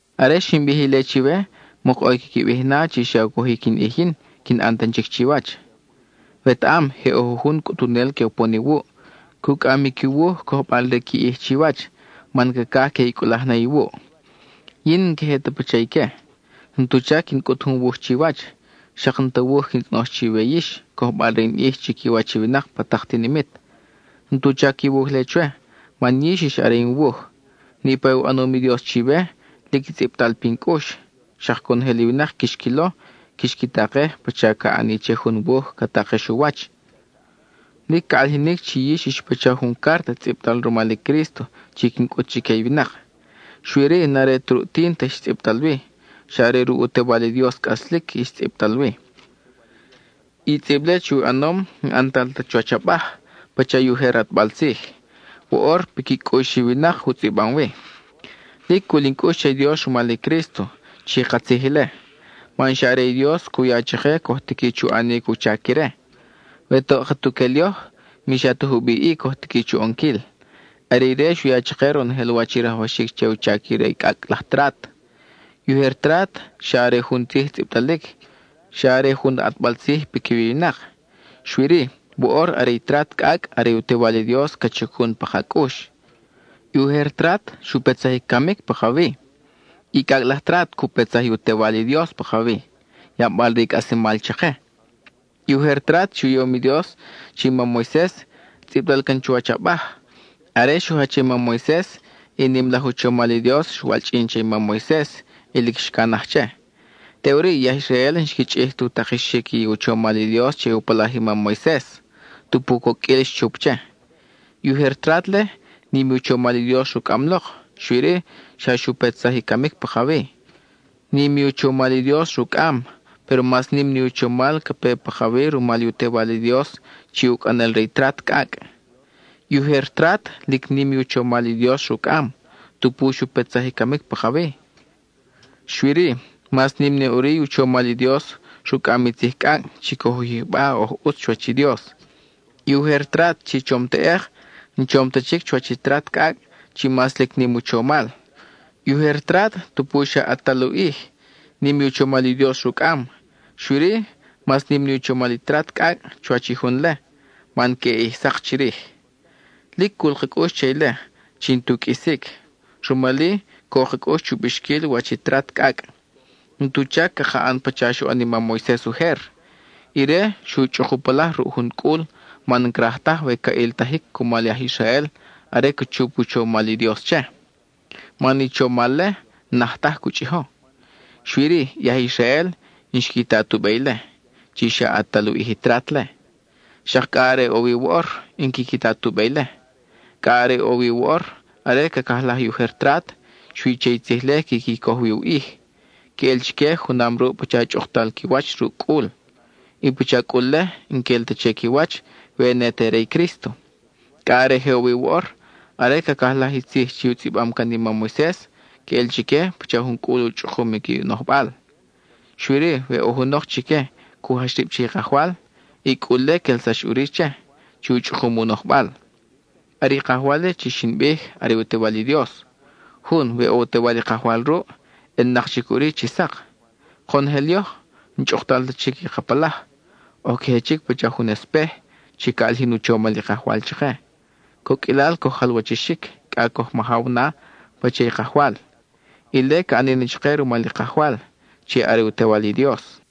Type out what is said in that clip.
Are xin bij ile chiwe, mok ʼo i quiqui bij na chi xa u cojic in ʼij yin, quin ʼan tan chic chiwach. Wetaʼam je ʼo jujun cʼutunel que upon iwuʼ, cucʼam i qui wuj cojbal re qui ʼij chiwach, man cacaj que i cʼulaj na iwuʼ. Yin n-in ta queje pacha ique; n-tu chac quin cʼut jun wuj chiwach; xak n-ta wuj quin tzʼonoj chiwe yix, cojbal re in ʼij chiquiwach i winak pa tak tinimit. N-tu chac i wuj-le chwe, man yix ix are in wuj; niʼpa u ʼanom i Dios chiwe, lic tzʼibtal pin cʼux. Xak conojel i winak quix quilo; quix qui takej pacha ca ʼani che jun wuj ca takex u wach. Lic ca ʼalijinic chi yix ix pacha jun cárta tzʼibtal rumal i Crísto chi quin cʼut chique i winak; xui-ri, n-are ta ruʼ tínta ix tzʼibtal wi, xa are ruʼ u Tewal i Dios cʼaslic ix tzʼibtal wi. I tzʼib-le chi u ʼanom, n-ʼantal ta chuwach abaj (pacha i ujer ʼatbal tzij); woʼor piqui cʼux i winak u tzʼibam wi. Lic cul in cʼux che i Dios rumal i Crísto, chi katzij ile, man xa are i Dios cu ya chake coj tiqui chu ʼanic u chac ire. We toʼ katuquel yoj, mi xa ta jubiʼ-i coj tiqui chu ʼonquil. Are ire xu ya chake ronojel wach i rajwaxic che u chac re i cʼacʼ laj trat. I ujer trat, xa are jun tzij tzʼibtalic, xa are jun ʼatbal tzij piquiwi i winak. Xui-ri, woʼor are i trat cʼacʼ are i u Tewal i Dios ca chacun pa ka cʼux. I ujer trat xu petsaj i camic pakawi; i cʼacʼ laj trat cu petsaj i u Tewal i Dios pakawi, yabal re i cʼaslemal chake. I ujer trat chi u yom i Dios che i mam Moises, tzʼibtal can chuwach abaj; are xu jach che i mam Moises, i nim laj u chomal i Dios xwalchʼin che i mam Moises y lic xcanaj che. Teʼuri i aj Israel n-xqui chʼij tu takexic i u chomal i Dios che u palaj i mam Moises, tupu coqʼuil xchup che. I ujer trat-le, nim i u chomal i Dios rucʼam lok, xui-ri, xa xu petsaj i camic pakawi. Nim i u chomal i Dios rucʼam, péro mas nim ni u chomal ca pe pakawi rumal i u Tewal i Dios chi ucʼanel re i trat cʼacʼ. I ujer trat lic nim i u chomal i Dios rucʼam, tupu xu petsaj i camic pakawi; xui-ri, mas nim na ʼuri i u chomal i Dios rucʼam i tzij cʼacʼ chi coj u yijba oj ʼutz chuwach i Dios. I ujer trat chi chom teʼek, n-chom ta chic chuwach i trat cʼacʼ chi mas lic nim u chomal. I ujer trat, tupu xa ʼatal u ʼij, nim i u chomal i Dios rucʼam, xui-ri mas nim ni u chomal i trat cʼacʼ chuwach i jun-le, man queʼe ʼij sak chirij. Lic cul ka cʼux che ile, chi n-tu qʼuisic, rumal-i co ka cʼux chu bixquil wach i trat cʼacʼ. N-tu chac caka ʼan pacha xoʼon i mam Moises ujer; ire xu chʼuk u palaj ruʼ jun cʼul man n-craj taj we ca ʼiltaj cumal i aj Israel are ca chup u chomal i Dios che. Man i chomal-le, n-naj taj cu chʼijo. Xui-ri, i aj Israel, n-xqui ta tu be ile, (chi xa ʼatal u ʼij i trat-le). Xak cʼa are ʼo wi woʼor, n-quiqui ta tu be ile. Cʼa are ʼo wi woʼor, are cacajlaj i ujer trat, xui che i tzij-le quiqui coj wi u ʼij; queʼel chique junam ruʼ pacha chʼuktal qui wach ruʼ cʼul. I pacha cʼul-le, n-quel ta che qui wach we ne te re i Crísto. Cʼa are je ʼo wi woʼor; are cacajlaj i tzij chi u tzʼibam can i mam Moises, queʼel chique pacha jun cʼul u chʼukum i qui nojbal. Xui-ri, we ʼo junok chique cu jach rib che i Kajwal, i cʼul-le quelsax ʼuri che, chi u chʼukum u nojbal. Are i Kajwal-le chi xin bij, are u Tewal i Dios. Jun, we ʼo u Tewal i Kajwal ruʼ, ʼelnak chic ʼuri chi sak. Konojel yoj, n-chʼuktal ta chic i ka palaj; oj queje chic pacha jun espej, chi ca ʼalijin u chomal i Kajwal chake; coqʼuilal coj jalwachixic cʼa coj majaw na pacha i Kajwal. Ile ca ʼani chake rumal i Kajwal, chi are u Tewal i Dios.